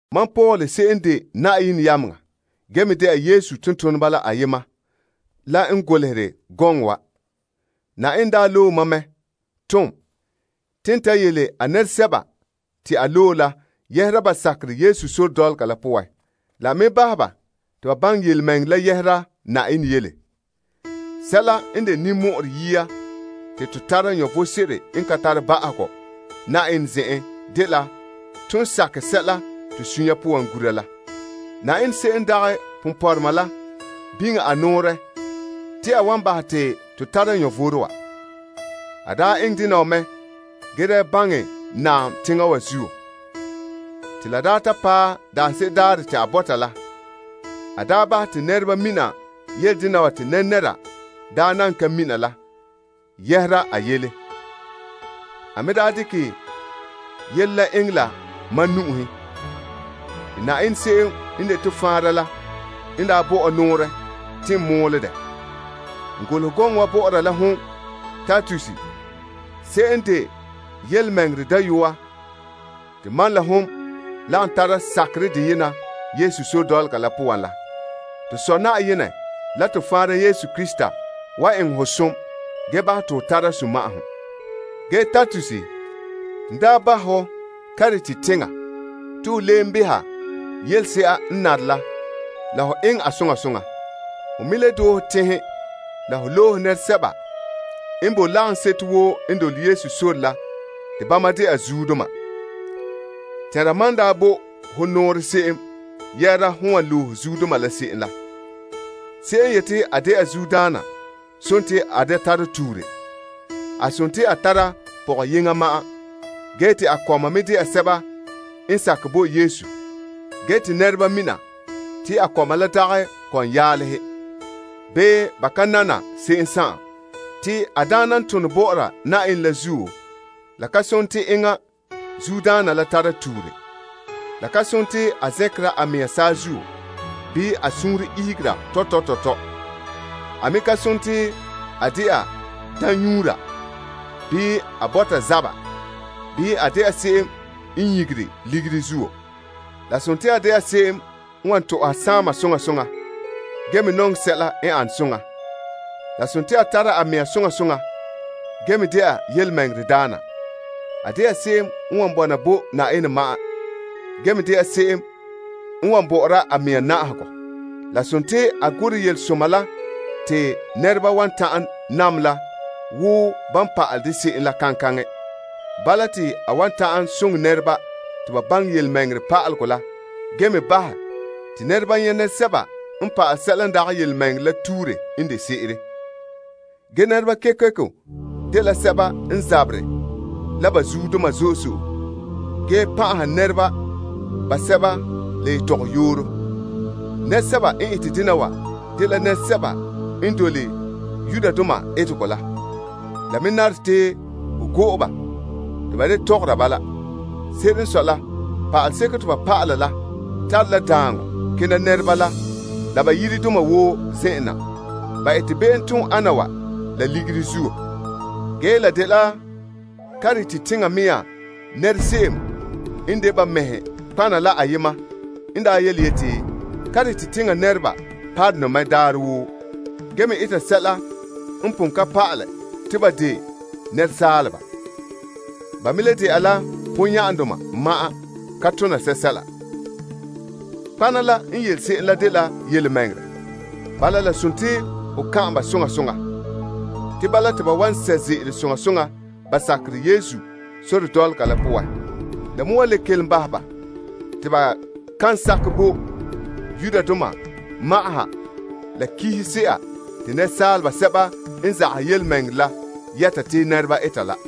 Mam Paul se'em n de Yenɛ yameŋa gee me de'a Yesu Krista tontoneba la ayema la n golehɛ gɔŋɔ wa. Yenɛ daa loe mam mɛ, tom te n ta yele a nɛresɛba te a loe la yɛhera ba sakerɛ Yesu sore dɔlɔga la poan. La n me bahɛ ba te ba baŋɛ yelemɛŋɛrɛ la yɛhera Yenɛ yele. Sɛla n de ninmɔ'ɔrɛ yia te to tara vom sebo n ka tare ba'ahegɔ Yenɛ zen'en dela ton sakɛ sɛla to sunya poan gura la. Yenɛ se'em n dagɛ ponpɔrɔma la biŋe a nɔɔrɛ te a wan bahɛ te to tara vom wa. A daa eŋɛ dena wa mɛ gee daa baŋɛ naam teŋa wa zuo. Te lan daa ta paɛ daanse'ere daarɛ te a bɔta la, a daa bahɛ te nɛreba mina yele dena wa te nɛnɛra daa nan ka mina la yɛhera a yele. A me daa dekɛ yele la eŋɛ la mam nu'uhen. Te Yenɛ se'em n de to Faanra la n daa bo ɔ nɔɔrɛ te n mɔɔlɛ dɛ. N golehɛ gɔŋɔ wa bɔ'ɔra la hon Titus se'em n de yelemɛŋɛrɛ dayɔa te mam la hon lagom tara sakerɛ deyena Yesu sore dɔlɔga la poan la. To Sɔ Yenɛ la to Faanra Krista Yesu wan eŋɛ ho som gee bahɛ te ho tara sunma'ahom. Ge Titus, n daa bahɛ hɔ Krete teŋa te ho leen maale yelese'a n nare la soŋa soŋa. Ho me le doohe teŋhe la ho loohe nɛresɛba n bo lagaŋseto woo n dole Yesu sore la te bama de'a zuodoma. Tɛnra mam n bo ho nɔɔrɛ se'em yɛhera hon wan loe zuodoma la se'em la. Se'em n yete a de'a zuodaana sontii a da tara tuure. A sontii a tara pɔgɔyeŋɔ ma'an, gee te a kɔma me de'a sɛba n sakɛ bo Yesu, ge te nɛreba mina te a kɔma la dagɛ kɔmyaalehe, bii ba ka nana se'em. Te a daana n tone bɔ'ɔra Yenɛ la zuo, la ka sone te enŋa zuodaana la tara tuure. La ka sontii a zɛnkera a mea saazuo bii a suunre ihegera tɔtɔ tɔtɔ. A me ka sontii a de'a daambugura bii a bɔta zaba bii a de'a se'em n nyigere ligiri zuo. La sontii a de'a se'em n wan tɔ'ɔha saama soŋa soŋa gee me nɔŋɛ sɛla n an soŋa. La sontii a tara a mea soŋa soŋa gee me de'a tontɔɔdaana. A de'a se'em n wan bɔna bo Yenɛ ma'an gee me de'a se'em n bo'ore a mea na'ahegɔ. La sontii a gorɛ yelesoma la te nɛreba wan ta'an nam la wo ban pa'alɛ dɛ se'em la kaŋkaŋɛ. Bala, te a wan ta'an soŋɛ nɛreba te ba baŋɛ yelemɛŋɛrɛ pa'alegɔ la gee me bahɛ te nɛreba nyɛ' nɛresɛba n pa'ale sɛla n dagɛ yelemɛŋɛrɛ la tuure n de se'ere. Ge nɛreba kekeko dela sɛba n zaberɛ la ba zuodoma zo'e zo'e gee pan'aha nɛreba basɛba la yetɔgɔyooro. Nɛresɛba n ete dena wa dela nɛresɛba n dole Yudoma etegɔ la. La me nare te ho go'e ba te ba da tɔgɔra bala. Se'ere n sɔe la, pa'aleseko te ba pa'ala la, tare la daaŋɔ kena nɛreba la la ba yiredoma woo zen'en na. Ba ete be'emtooma ana wa la ligiri zuo. Ge la daa dela Krete teŋa mea nɛra se'em n de ba mɛhe nɔtɔgɔhadoma la ayema n daa yeti, Krete teŋa nɛreba parone mɛ daarɛ woo gee me eta sɛla n pon ka pa'ala te ba de nɛresaaleba. Ba me le de'a la ponya'andoma ma'an ka tona sɛsɛla. Nɔtɔgɔha la n yele se'em la dela yelemɛŋɛrɛ. Bala, la sontii ho kan'an ba soŋa soŋa. Te bala te ba wan sɛ' ze'ele soŋa soŋa ba sakerɛ Yesu sore dɔlɔga la poan. La me wan le kelom bahɛ ba te ba kan sakɛ bo Yudoma sɔlema la kihise'a te nɛresaaleba sɛba n zagahɛ yelemɛŋɛrɛ la yɛta te nɛreba eta la.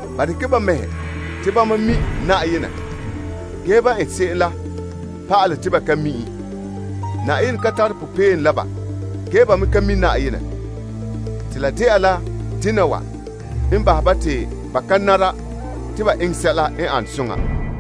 Ba dekɛ ba mɛhe te bama mi' Yenɛ, ge ban ete se'em la pa'ale te ba ka mi' en. Yenɛ ka tare popeelom la ba. Ge ba me ka mi' Yenɛ. Te la dela dena wa n bahɛ ba te ba ka nara te ba eŋɛ sɛla n ane soŋa.